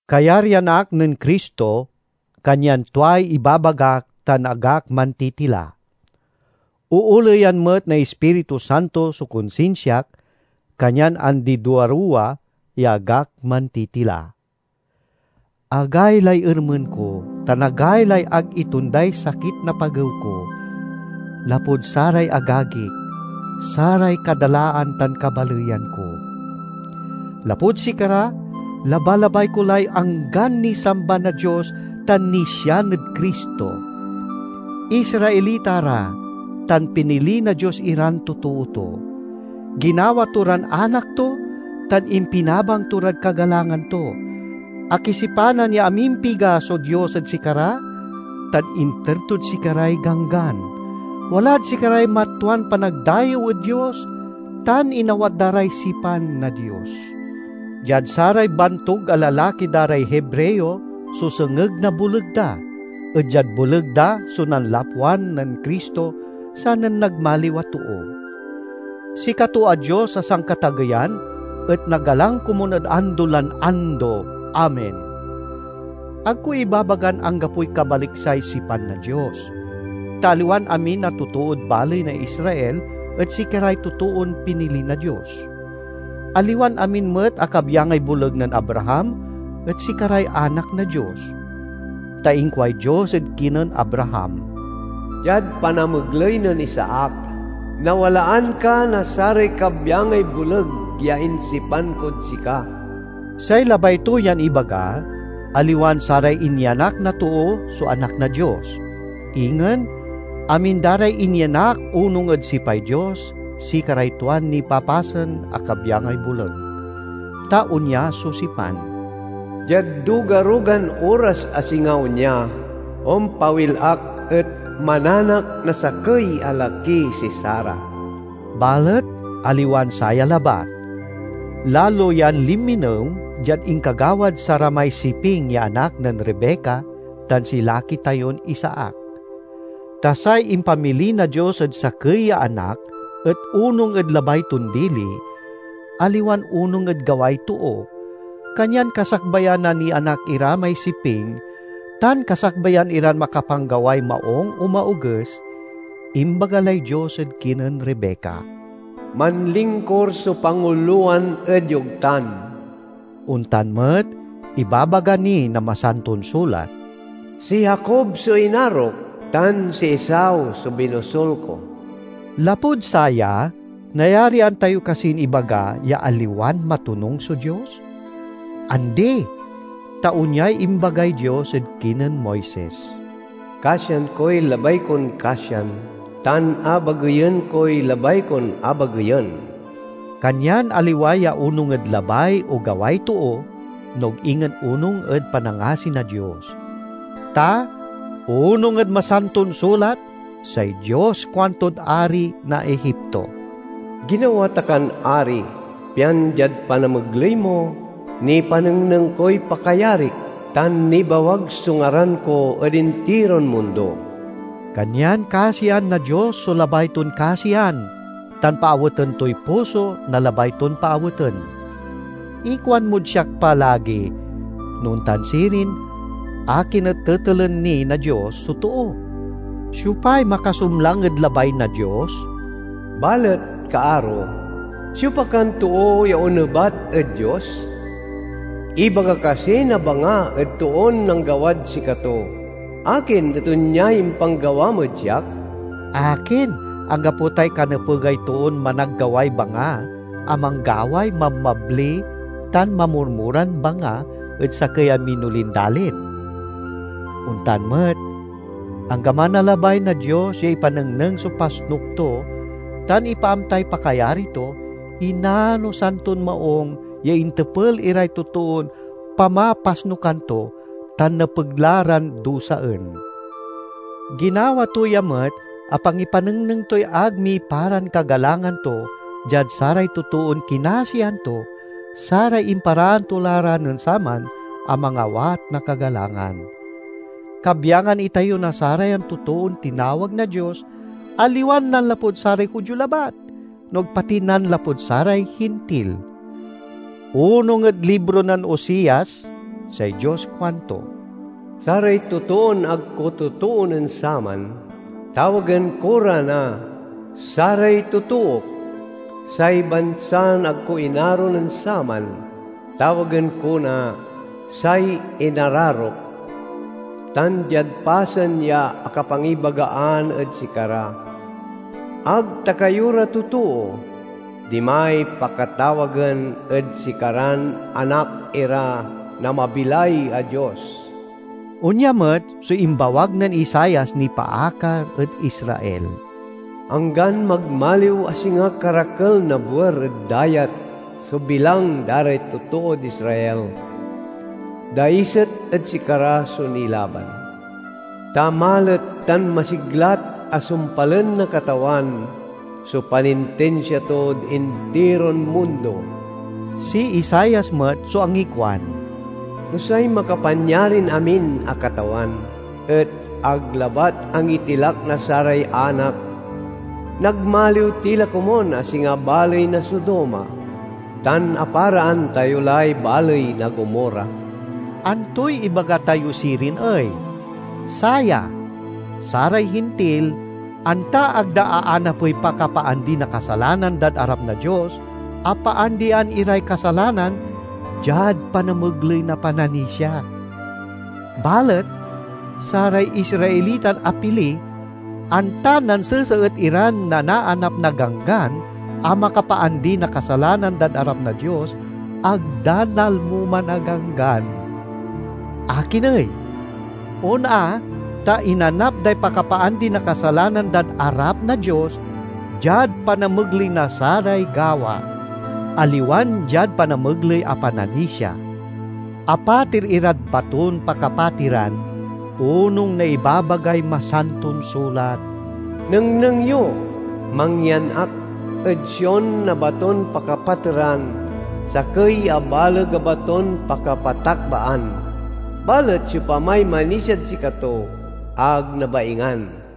Kayaryan ak nen Cristo, kanyan tuay ibabagak tan ag ak mantitila. Ooleyan met na Ispiritu Santo so konsinsiak, kanyan andi-duaruwa ya ag ak mantitila. Agaylay ermen ko, tan agaylay ag itonday sakit na pagew ko, lapud saray agagik, saray kadalaan tan kabaleyan ko. Lapud sikara, labalabay ko lay anggan nisamba na Dios tan nisian ed Cristo. Israelita ra tan pinili na Dios iran totoo to. Ginawa to ran anak to tan impinabang to rad kagalangan to. Akisipanan ya amimpiga so Dios ed sikara tan inter tod sikaray Ganggan. Walad sikaray matwan panagdayew ed Dios, tan inawat da ray sipan na Dios. Diad saray bantug a lalaki da ray Hebreo so sengeg na boleg da, et diad boleg da so nanlapwan nen Cristo sanen nagmaliw a too. Sikato a Dios a Sankatageyan et nagalang komun ed ando lan ando! Amen. Ag ko ibabagan anggapoy kabaliksay sipan na Dios; ta aliwan amin a totood baley na Israel et sikaray totoon pinili na Dios. Aliwan amin met a kabyangay boleg nen Abraham et sikaray anak na Dios. Ta inkuay Dios ed kinen Abraham, "Diad panamegley nen Isaac nawalaan ka na saray kabyangay boleg ya insipan kod sika." Say labay to yan ibaga, aliwan saray inyanak na too so anak na Dios; ingen amin da ray inyanak onung ed sipay Dios sikaray tuan nipapasen a kabyangay boleg. Ta onya so sipan, "Diad duga-rugan oras a singa onya, ompawil ak et mananak na sakey a laki si Sara." Balet aliwan saya labat. Lalo yan linminew diad inkagawad saramay siping ya anak nen Rebeca tan si laki tayon Isaac. Ta say impamili na Dios ed sakey ya anak et onung ed labay ton dili, aliwan onung ed gaway too, kanyan kasakbayan a nianak ira may siping tan kasakbayan iran makapanggaway maung o maoges, imbaga lay Dios ed kinen Rebeca, "Manlingkur so pangulowan ed yogtan." Ontan met ibabaga ni na Masanton Sulat, "Si Jacob so inarok, tan si Esau so binosul ko." Lapud saya, nayarian tayo kasin ibaga ya aliwan matonung so Dios? Andi! Ta onyay imbagay Dios ed kinen Moises, "Kasian koy labay kon kasian tan abageyen koy labay kon abageyen." Kanyan aliwa ya onung ed labay o gaway too, no ag ingen onung ed panangasi na Dios. Ta onung ed Masanton Sulat say Dios kuantod ari na Egipto, "Ginawa ta kan ari, pian diad panamegley mo, nipanengneng koy pakayarik tan nibawag so ngaran ko ed intiron mundo." Kanyan kasian na Dios so labay ton kasian, tan paaweten toy puso na labay ton paaweten. Ikuan mod siak pa lagi, "No ontan sirin, akin et tetelen ni na Dios so too? Siopay makasumlang ed labay na Dios?" Balet, kaaro, siopa kan too ya onebat ed Dios? Ibaga kasi na banga ed toon nanggawad sikato, "Akin et onyay impanggawam ed siak?" Akin, anggapo tay kanepegay toon managgaway banga a manggaway mabmabli tan mamurmuran banga ed sakey a minolin dalin? Ontan met, anggaman a labay na Dios ya ipanengneng so pasnuk to tan ipaamtay pakayari to, inanosan ton maung ya intepel iray totoon pamapasnukan to tan nepeg la ran dusaen. Ginawa to ya met a pangipanengneng toy ag miparan kagalangan to diad saray totoon kinasian to, saray imparaan to la ra nen saman a mangawat na kagalangan. Kabyangan itayo na sarayan totoon tinawag na Dios, aliwan nanlapud saray Judio labat, no ag pati nanlapud saray Hintil. Onung ed libro nen Oseas, say Dios kuanto, "Saray totoon ag ko totoo nen saman, tawagen ko ra na 'Saray totook.' Say bansan ag ko inaro nen saman, tawagen ko na 'Say inararok.' Tan diad pasen ya akapangibagaan ed sikara, 'Ag ta kayo ra totoo,' dimay pakatawagen ed sikaran anak ira na mabilay a Dios." Onya met so imbawag nen Isaias nipaakar ed Israel: "Anggan magmaliw a singa karakel na buer ed dayat so bilang da ray totood Israel, daiset ed sikara so nilaban. Ta malet tan masiglat a sumpalen na Katawan so panintinsia tod intiron mundo." Si Isaias met so angikuan, "No say Makapanyarin-amin a Katawan et ag labat angitilak na saray anak, nagmaliw ti la komun a singa baley na Sodoma, tan aparaan tayo lay baley na Gomorra." Antoy ibaga tayo sirin ey? Saya: saray Hintil, anta ag da aanapey pakapaandi na kasalanan dad arap na Dios, apaandian iray kasalanan diad panamegley na pananisia. Balet saray Israelitan apili, anta nanseseet iran nanaanap na ganggan a makapaandi na kasalanan dad arap na Dios, ag da nalmo man a ganggan. Akin ey? On a, ta inanap day pakapaandi na kasalanan dad arap na Dios diad panamegley na saray gawa, aliwan diad panamegley a pananisia. Apater irad baton pakapateran, onung na ibabagay Masanton Sulat, "Nengneng yo, mangyan ak ed Sion na baton pakapateran, sakey a baleg a baton pakapatakbaan. Balet siopamay manisiad sikato ag nabaingan."